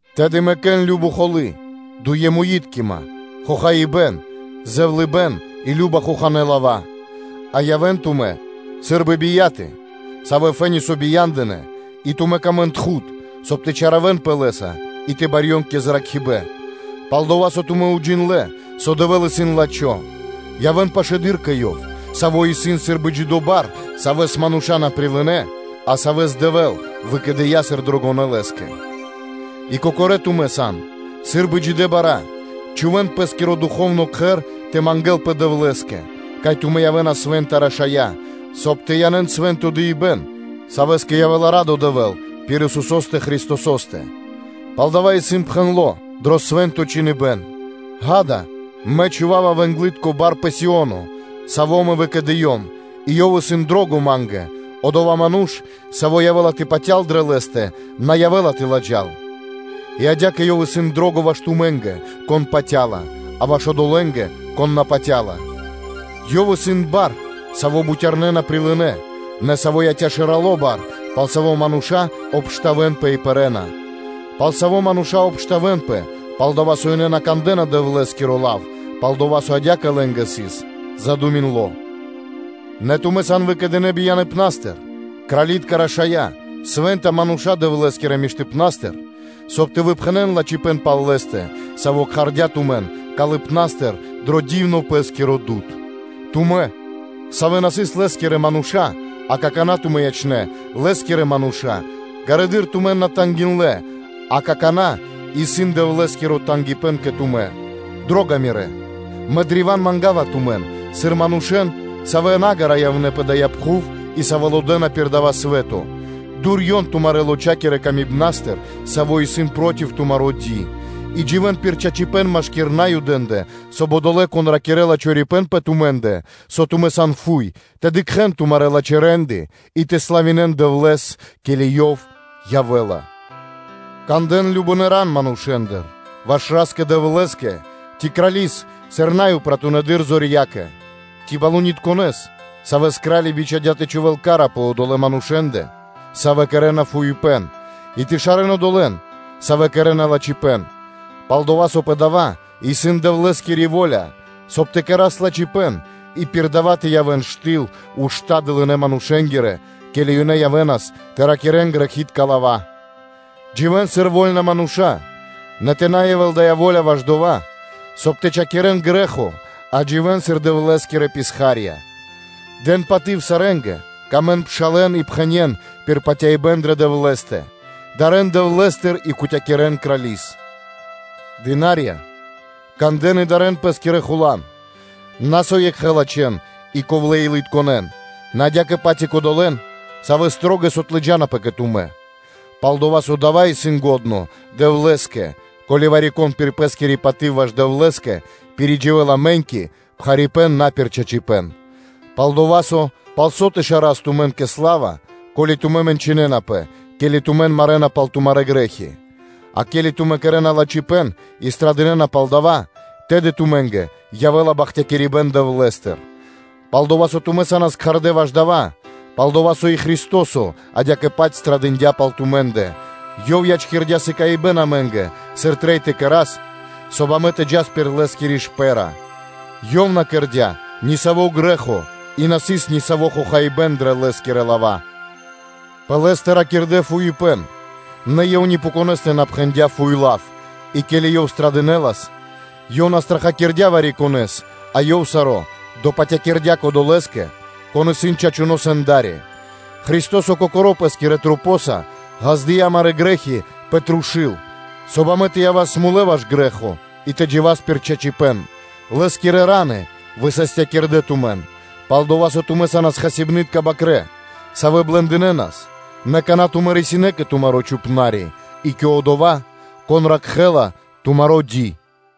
Тэды мэкэ́н кажно холы́, фрэнтыма, дуемуиткима, зэвлыныпэ́н и кажна хоханэ́ лава́, а явэ́н тумэ́ сы́рбы бияты, савэ́ фэ́ни со бия́ндынэ, и тумэ́ тырдэнпэ кэ лавитко тхуд (Дэвлэ́скиро лав), соб (кай) тэ чалякирэнпэ лэ́са и тэ барьён кэ зракхибэ́н, пал-дова́ со тумэ́ уджиндлэ́, со Дэвэ́л исын лачхо́. Явэ́н пашылэды́р кэ Ёв, Саво́ исын сы́рбы джидо́ бар, Савэс мануша́ на прилынэ́, а Савэс Дэвэ́л выкэдыя́ сыр Дрогонэс Лэ́скэ, и кокорэ́ тумэ́, савэ́ сан сы́рбы джидэ́ бара́, кэрэ́н пэ́стыр духовно кхэр тэ мангэ́лпэ Дэвлэ́скэ, соб (кай) тумэ́ тэ явэ́н свэ́нта рашая́, соб (кай) тэ янэ́н свэ́нто дыибэ́н, савэ́скэ явэ́ла радо Дэвэ́л пир Исусо́стэ Христосо́стэ. Палдава́ исын пхэндло́ дро Свэ́нто Чхиныбэ́н: “Ѓа́да, мэ чхува́ва вэнглытко бар пэ Сио́но, Саво́ Мэ выкэдыём и Ёв исын дро́го Ма́нгэ: одова́ ману́ш, саво́ явэ́ла тэ патял дрэ Лэ́стэ, на явэ́ла тэ ладжал: и адя́кэ Ёв исын дро́го ваш тумэ́нгэ, кон патя́ла, а ваш одолэ́нгэ, кон на патя́ла, Ёв исын бар, саво́ бутярнэ́ на прилынэ́, нэ саво́ яця́ шэралэ́ барэса, пал саво́ мануша́ обштавэнапэ и пэрэ́на; пал саво́ мануша́ обштавэнапэ, пал-дова́ со ёнэ на кандэ́на Дэвлэ́скиро лав, пал-дова́ со адя́кэ лэ́нгэ сыс задуминдло. Нэ тумэ́ сан выкэдынэ́ бияныпнастыр, кралитка рашая́, свэ́нта мануша́ Дэвлэ́скирэ миштыпна́стыр, соб (кай) тэ выпхэнэн лачхипэ́н пал Лэ́стэ, Саво́ кхардя́ тумэн калыпна́стыр дро дивно Лэ́скиро дуд (свэ́то); тумэн, савэ́ на сыс Лэ́скирэ мануша́, а какана́ тумэ́ ячнэ́ Лэ́скирэ манушэ́нца, ґарэдыр тумэн на тангиндлэ (на жалиндлэ), акана́ исын Дэвлэ́скиро тангипэ́н кэ тумэ́. Дро́га мирэ́! Мэ древа́н манга́ва тумэн, сыр манушэ́н, савэ́ наґара явнэ́ пэ дая́ пхув и савэ́ лодэна пир дава́ свэ́то: дурьён тумарэ́ лочакирэ камибнастыр, саво́ исын проти тумаро́ ди; и дживэ́н пир чачипэ́н машки́р Наюдэ́ндэ, соб (кай) одолэ́, кон ракирэ́ла чорипэ́н пэ тумэ́ндэ, со тумэ́ сан фуй, тэ дыкхэ́н тумарэ́ лачхэ́ рэ́нды и тэ славинэ́н Дэвлэ́с, ке́ли Ёв явэ́ла. Кандэ́н кажнонэ́ ран манушэ́ндыр ваш Ра́скэ-Дэвлэ́скэ: ци крали́с сыр най упратунэдыр зорьякэ, ци балунитконэс (правителёс), савэ́с кра́ли бичхадя́ тэ чхувэ́л ка́ра пэ одолэ́ манушэ́ндэ, савэ́ кэрэ́на фуипэ́н, и тэ шарэ́н одолэ́н, савэ́ кэрэ́на лачхипэ́н. Пал-дова́ со пэ дава́ исын Дэвлэ́скири во́ля, соб (кай) тэ кэра́с лачхипэ́н и пир дава́ тэ явэ́н штыл ушта́ дылынэ́ манушэ́нгирэ, ке́ли ёнэ явэ́нас тэ ракирэ́н грэхи́тка лава́. Дживэ́н сыр вольна мануша́; нэ тэ на явэ́л дая́ во́ля ваш дова́, соб (кай) тэ приучхакирэн грэ́хо, а дживэ́н сыр Дэвлэ́скирэ писха́рья. Дэн паты́в сарэ́нгэ, сыкавэ́н паты́в пшалэ́нгэ и пхэнэ́н пир патяибэ́н дрэ Дэвлэ́стэ, дарэ́н Дэвлэ́стыр и кутякирэн крали́с. Дынарья́лэ, кандэ́н и дарэ́н пэ́скирэ хуландыр, на со екхэ лачхэн и ковлэ́-илытконэн, нэ адя́кэ-паць и кодолэ́н, савэ́ биилыткэс (шылалэс) отлыджанапэ кэ тумэ́. Пал-дова́ со дава́ исын лачхо́ Дэвлэ́скэ, ко́ли вари-кон пир пэ́скири паты́в ваш Дэвлэ́скэ пиридживэла мэ́ньки, пхарипэ́н на пир чачипэ́н. Пал-дова́ со, пал со тэ шарас тумэн кэ сла́ва, ко́ли тумэ́ мэнчынэнапэ, ке́ли тумэн марэна пал тумарэ́ грэ́хи? А ке́ли тумэ́ кэрэ́на лачхипэ́н и страдынэна пал дава́, тэды тумэ́нгэ явэ́ла бахтякирибэ́н Дэвлэ́стыр. Пал-дова́ со тумэ́ са́нас кхардэ́ ваш дава́, пал-дова́ со и Христо́со адя́кэ-паць страдындя пал тумэ́ндэ, Ёв ячкирдя́ сыкаибэ́н (приме́ро) амэ́нгэ, сыр трэй тэ кэра́с, соб (кай) амэ тэ джас пир Лэ́скири шпэ́ра (слядо): “Ёв на кэрдя́ нисаво́ грэ́хо, и на сыс нисаво́ хохаибэ́н дрэ Лэ́скирэ лава́”, пэ Лэ́стэ ракирдэ́ фуипэ́н, нэ Ёв ни пэ конэ́стэ на пхэндя́ фуй лав, и ке́ли Ёв страдынэлас, Ёв на страхакирдя вари-конэ́с, а Ёв саро́ допатякирдя Кодолэ́скэ, Кон исын Чачуно́ Сэнда́ри; Христо́со Кокоро́ Пэ́скирэ Масэнца ґаздыя́ амарэ́ грэ́хи пэ трушу́л, соб (кай) амэ тэ явас мулэ́ ваш грэ́хо и тэ джива́с пир чачипэ́н: Лэ́скирэ фра́нсы (раны) высастякирдэ тумэн. Пал-дова́ со тумэ́ са́нас хасибны́тка бакрэ́, савэ́ блэндынэнас, нэ какана́ тумэ́ рисинэ́ кэ тумаро́ Чхупна́ри (Пастырё) и кэ Кхангирья́киро Дыкхибнаскиро (Блюстителё), Саво́ ракхэ́ла тумаро́ ди.